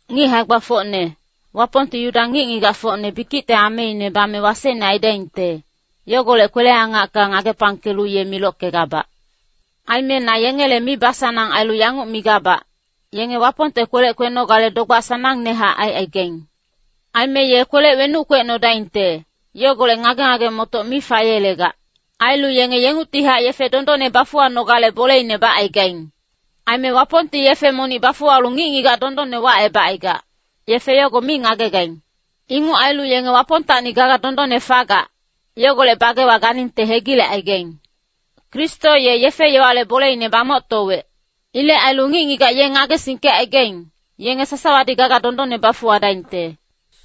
Ngic hae-gbafocne, Wapongti Yuda ngic-ngigacfocne bikicte ameine bame wasecne aidaingte, yogolec kwele-angacka ngagepangkelu ye milockegabac. Aime na yengele mibasanang ailu yanguc migabac, yenge Wapongte kwelec kwenogale dogbac sanangnehac aicaigaing. Aime ye kwelec wenuc kwecnodaingte, yogolec ngage-ngage-motoc mi fayelegac. Ailu yenge yengungtihac yefe dondonne bafuwanogale boleine bacaigaing. Aime Wapongti yefe monic bafuwalu ngic-ngigac dondonne wacebacaigac, yefe yogo mi ngagegaing. Inguc ailu yenge Wapongtacni gaga dondonne fagac, yogolec bagewa ganingte hegilecaigaing. Kristo ye yefe-yowale boleine bamoctowec. Ilec ailu ngic-ngigac ye ngagesingkecaigaing, yenge sasawadi gaga dondonne bafuwadaingte.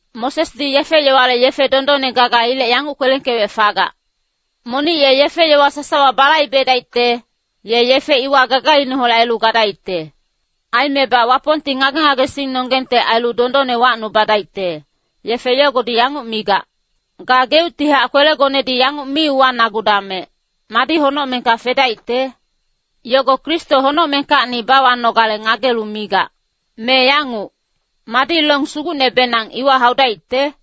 Mosesdi yefe-yowale yefe dondonne gaga yogolec yanguc kwelengkewec fagac, “Monic ye yefe-yowa sasawa balaibedaicte, ye yefe iwa gagaineholec ailu gadaicte.” Aimebac Wapongti ngage-ngagesingnonggengte ailu dondonne wacnubadaicte, yefe yogodi yanguc migac, “Gageuctihac kwelegonedi yanguc mi uwanagudamec, madi honocmengka fedaicte?” Yogo Kristo honocmengkacni bawanogale ngagelu migac. Me yanguc, “Madi long sugucnebenang iwa haudaicte?”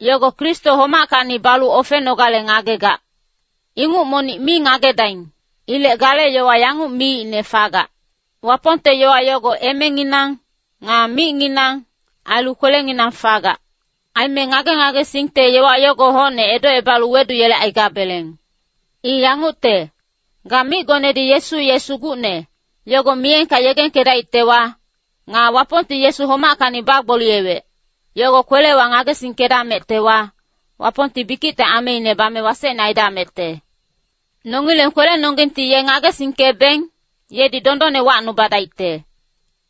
Yogo Kristo homackacni balu ofenogale ngagegac. Inguc monic mi ngagedaing. Ilec gale yowa yanguc miicne fagac, “Wapongte yowa yogo emenginang, nga micnginang, ailu kwelenginang fagac.” Aime ngage-ngagesingte yowa yogo hocne edocebalu weduyelecaigabeleng. I yangucte, ga micgonedi Yesu ye Sugucne, yogo miyengka yegengkedaictewa, nga Wapongti Yesu homackacni bagboliyewec, yogo kwelewa ngagesingkedamectewa, Wapongti bikicte ameine bame wasecne aidamecte. Nongileng kwelenonggengti ye ngagesingkebeng, yedi dondonne wacnubadaicte.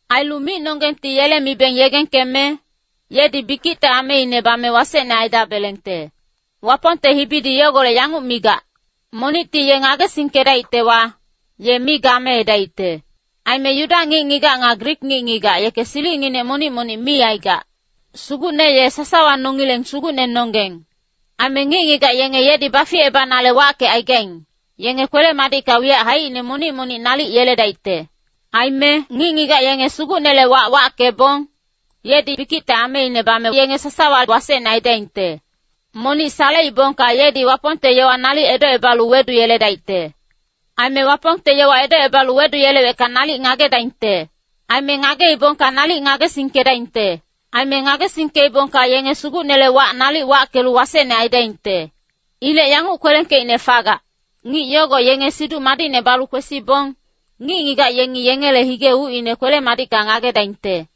Ailu micnonggengti yele mibeng yegengkeme, yedi bikicte ameine bame wasecne aidabelengte. Wapongte hibidi yogolec yanguc migac, “Monicti ye ngagesingkedaictewa, ye mi gameedaicte.” Aime Yuda ngic-ngigac nga Grik ngic-ngigac yeke silicnginec monic-monic mi aigac. Sugucne ye sasawa nongileng Sugucnenonggeng. Aime ngic-ngigac yenge yedi baficebanale wackecaigaing, yenge kwele-madicka wiyac haicine monic-monic nalic yeledaicte. Aime “Ngic-ngigac yenge Sugucnele wac wackebong, yedi bikicte ameine bame yenge sasawa wasecne aidaingte.” Monic saleibongka yedi Wapongte yowa nalic edocebalu weduyeledaicte. Aime Wapongte yowa edocebalu weduyelewecka nalic ngagedaingte. Aime ngageibongka nalic ngagesingkedaingte. Aime ngagesingkeibongka yenge Sugucnele wac nalic wackelu wasecne aidaingte. Ilec yanguc kwelengkeicne fagac, “Ngic yogo yenge Siduc Madicne balu kwesibong, ngic-ngigac yengi yengele hige ucine kwele-madicka ngagedaingte.”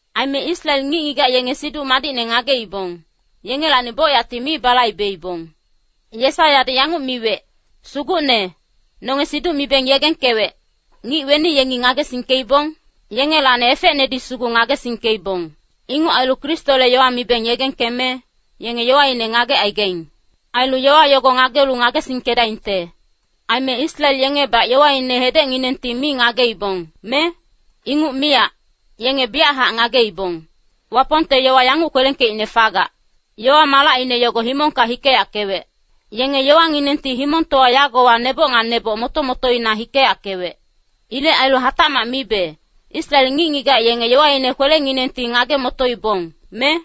Aime Israel ngic-ngigac yenge Siduc Madicne ngageibong, yengelacni bocyacti mi balaibeibong. Yesaiyadi yanguc miwec, “Sugucne, nonge siduc mibeng yegengkewec, ngic weni yengi ngagesingkeibong? Yengelacni efecnedi sugu ngagesingkeibong.” Inguc ailu Kristole yowa mibeng yegengkeme, yenge yowaine ngagecaigaing. Ailu yowa yogo ngagelu ngagesingkedaingte. Aime Israel yengebac yowaine hedecnginengti mi ngageibong, me? Inguc miyac, yenge biyachac ngageibong. Wapongte yowa yanguc kwelengkeicne fagac, “Yowa-malacine yogo himongka hikeyackewec. Yenge yowanginengti himongtowa yagowa neboc nga neboc moto-motoina hikeyackewec.” Ilec ailu hatacmac mibe, Israel ngic-ngigac yenge yowaine kwelenginengti ngage-motoibong, me?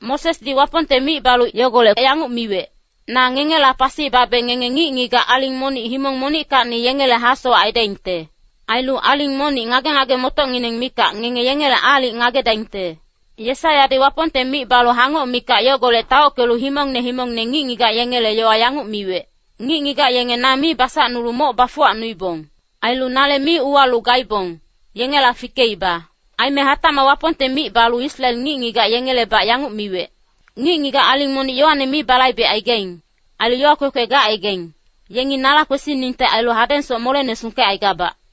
Mosesdi Wapongte mic balu yogolec yanguc miwec, “Na ngengela pasi babe ngenge ngic-ngigac aling monic himong monickacni yengele hasowac aidaingte. Ailu aling monic ngage-ngage-motocngineng mikac, ngenge yengele aalic ngagedaingte.” Yesaiyadi Wapongte mic balu hangoc mikac yogolec taockelu himongne himongne ngic-ngigac yengele yowa yanguc miwec, “Ngic-ngigac yenge na mi basacnulu moc bafuwacnuibong. Ailu nale mi uwalu gaibong, yengela fikeiba.” Aime hatac Wapongte mic balu Israel ngic-ngigac yengelebac yanguc miwec, “Ngic-ngigac aling monic yowane mi balaibecaigaing, ailu yowa kwekwe gacaigaing, yenge nala kwesiningte ailu, hadengsoc molene sungkecaigabac.”